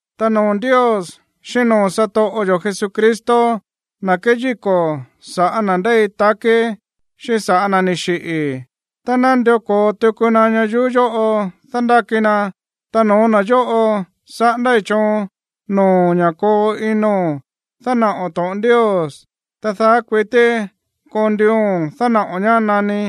Ta noo̱ Ndios xíꞌín noo̱ satoꞌo yo̱ Jesucristo, na̱ keyíko̱ sa̱ꞌá na̱ ndéi takí xíꞌín sa̱ꞌá na̱ ni̱ xiꞌi̱ tá nandió ko̱o tuku na ñayuú yóꞌo dándáki na, ta no̱ó na̱ yóꞌo saꞌándái̱ choon noo̱o̱n ña̱ koo ino̱n dánaꞌo̱n to̱ꞌon Ndios. Ta daá kuití koo nduuo̱n dánaꞌo̱n ñá nani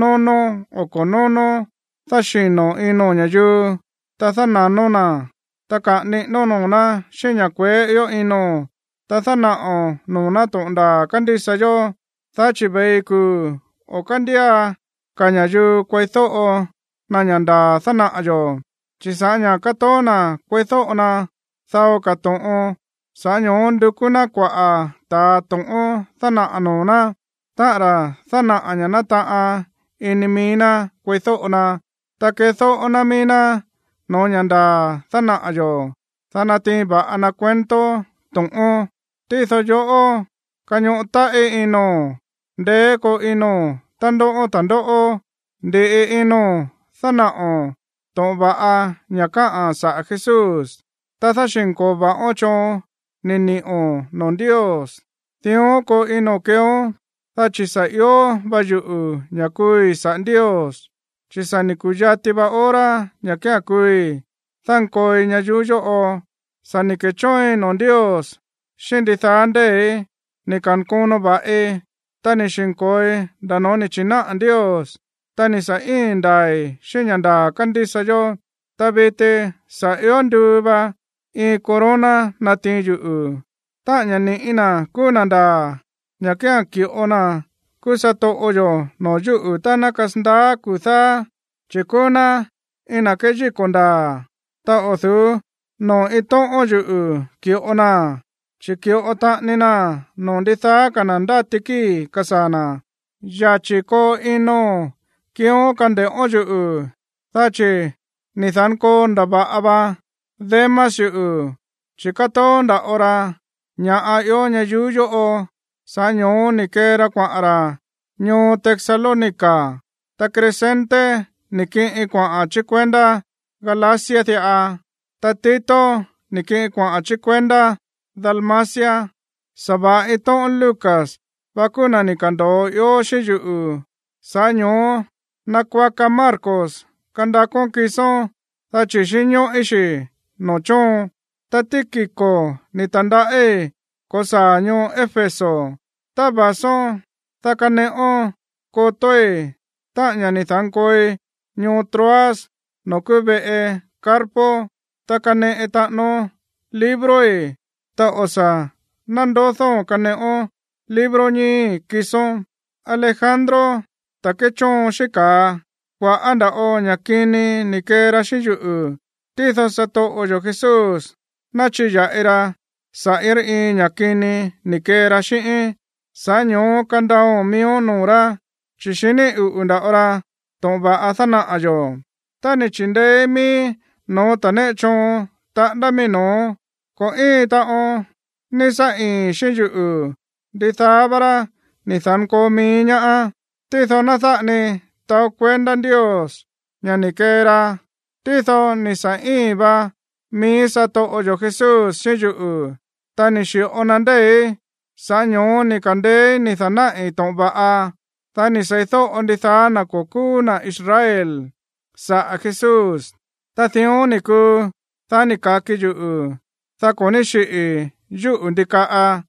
nónó o ko̱ nónó. Dáxino̱ ino̱n ña̱yuu, ta dána̱nón na̱, ta kaꞌa̱n niꞌínón noo̱ ná xíꞌín ña̱ kueé ió ino̱n, ta dánaꞌo̱n noo̱ ná to̱ꞌon ndaa̱ kándísa yó. Chi̱ ve̱i kuu̱ o̱ kándía ka̱ ña̱yuu kueídóꞌo na ña̱ ndaa̱ dánaꞌa̱ yo̱, chi̱ sa̱ꞌá ña̱ katoó na̱ kueídóꞌo na dao ka̱ to̱ꞌon, sa̱ꞌá ño̱ó ndukú ná kuaꞌa̱ ta̱ to̱ꞌón dánaꞌa̱ noo̱ ná, táꞌa̱n ra̱ dánaꞌa̱ ña̱ nataꞌan ini mií ná kueídóꞌo na. Ta kedóꞌó ná mií ná no̱ó ña̱ ndaa̱ dánaꞌa̱ yo̱, dá natiin va̱ꞌa na cuento to̱ꞌón. Tído yoꞌó, kañoꞌo táꞌí ino̱n, ndeé koo ino̱n tá ndóꞌón ta̱ndóꞌó, ndi̱ꞌi ino̱n dánaꞌo̱n to̱ꞌon va̱ꞌa ña̱ káꞌa̱n saꞌa̱ Jesús, ta dáxi̱nko̱o va̱ꞌón xíꞌín choon ni̱ ni̱ꞌo̱n noo̱ Ndios. Dión koo ino̱n keeón, dá chi̱ sa̱ ió va yuꞌu̱ ña̱ kuui̱ saꞌa̱ Ndios, chi̱ sa̱ ni̱ ku̱yati va hora ña̱ kía̱n kuui̱ dánkooi ñayuú yóꞌo. Sa̱ ni̱ ke̱chóoin noo̱ Ndios xíꞌín ndidaá ndée̱í. Ni̱ ka̱nkono va̱ꞌi, ta ni̱ xi̱nko̱oi nda̱ noo̱ ni̱ chi̱náꞌa̱ Ndios, ta ni̱ sa̱ íi̱n ndaa̱i̱ xíꞌín ña̱ ndaa̱ kándísa yó. Ta viti sa̱ ió nduu va iin corona natiin yuꞌu̱, táꞌa̱n ña̱ ni̱ꞌí na̱ kúú na̱ ndaa̱, ña̱ kía̱n ki̱ꞌo na̱ kúú satoꞌo yo̱ noo̱ yúꞌu̱ tá ná kasandaá kuu̱ dáá, chi̱ kúú ná iin na̱ kéyíko̱ ndaa̱. Ta o̱ du̱ú noo̱ iin tóꞌón yuꞌu̱ ki̱ꞌo naa̱n, chi̱ ki̱ꞌo taꞌani naa̱n noo̱ ndidaá ka̱ na̱ ndáti kíi̱ kasaa̱ na̱. Yachi̱ koo ino̱n kiión kande̱ꞌón yuꞌu̱. Dá chi̱ ni̱ da̱nkoo ndava̱ꞌa va Demas yuꞌu̱, chi̱ kátoó nda̱ꞌo ra ña̱ ió ñayuú yóꞌo, sa̱ꞌá ño̱ó ni̱ kee ra kuaꞌa̱n ra̱ ñoo Tesalónica. Ta Crescente ni̱ kiꞌin kuaꞌa̱n chí kuendá Galacia diꞌa, ta Tito ni̱ kiꞌin kuaꞌa̱n chí kuendá Dalmacia. Sa̱va̱ꞌa iin tóꞌón Lucas vá kúú na̱ ni̱ ka̱ndo̱o ió xíꞌín yuꞌu̱. Sa̱ꞌá ño̱ó nakuaka Marcos kandakón kisón, dá chi̱ xínñóꞌí xi̱ noo̱ chóon. Ta Tíquico ni̱ ta̱ndaꞌí ko̱saa̱ ñoo Éfeso. Tá va̱són, dá kaneꞌón kotói̱, táꞌa̱n ña̱ ni̱ da̱nkooi ñoo Troas noo̱ kúú veꞌe Carpo, ta kaneꞌe taꞌánón libroi̱, ta o̱ sa̱ nándodóo̱n kaneꞌón libro ñíi̱ kisón. Alejandro, ta̱ kéchóon xíꞌín ka̱a, kua̱ꞌá nda̱ꞌo ña̱ꞌa kini ni̱ kee ra xíꞌín yuꞌu̱. Tído satoꞌo yo̱ Jesús ná chiya̱ꞌi ra saꞌa̱ iin rá iin ña̱ kini ni̱ kee ra xíꞌíín. Sa̱ꞌá ño̱ó kandaao̱n miíón noo̱ rá, chi̱ xiní uꞌu̱ nda̱ꞌo ra to̱ꞌon va̱ꞌa dánaꞌa̱ yo̱. Tá ni̱ chi̱ndeéí miíí no̱ó ta̱ néꞌe choon taꞌándá mií no̱ó, ko̱ íin taꞌon ní sá íi̱n xíꞌín yuꞌu̱. Ndidaá vá rá ni̱ da̱nkoo mií ñaá. Tído ná dáꞌa ni taó kuendá Ndios ña̱ ni̱ kee ra. Tído ni̱ sa̱ íi̱n va mií satoꞌo yo̱ Jesús xíꞌín yuꞌu̱, ta ni̱ xi̱ꞌo na ndée̱í, sa̱ꞌá ño̱ó ni̱ ka̱ndeéí ni̱ da̱náꞌi̱ to̱ꞌon va̱ꞌa, dá ni̱ seídóꞌo ndidaá na̱ ko̱ kúú na̱ Israel saꞌa̱ Jesús. Ta dión ni̱ kuu, dá ni̱ ka̱ki yuꞌu̱, dá ko̱ ní xíꞌi̱i̱ yúꞌu̱ ndikaꞌa.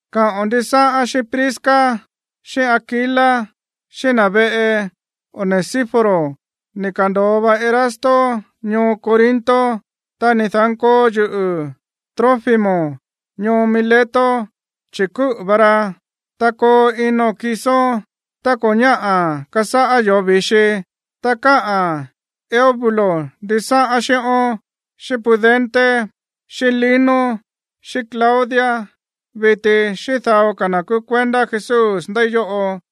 Káꞌo̱n ndisáꞌán xíꞌín Prisca xíꞌín Aquila, xíꞌín na̱ veꞌe Onesíforo. Ni̱ ka̱ndo̱o va Erasto ñoo Corinto, ta ni̱ da̱nkoo yuꞌu̱ Trófimo ñoo Mileto, chi̱ kúꞌu̱ va ra. Ta koo ino̱n kisón tá ko̱ ñáꞌa̱ kasáꞌá yoo̱ vi̱xi. Ta káꞌa̱n Eubulo ndisáꞌán xíꞌón, xíꞌín Pudente, xíꞌín Lino, xíꞌín Claudia viti xíꞌín dao ka̱ na̱ kúú kuendá Jesús ndéi yóꞌo.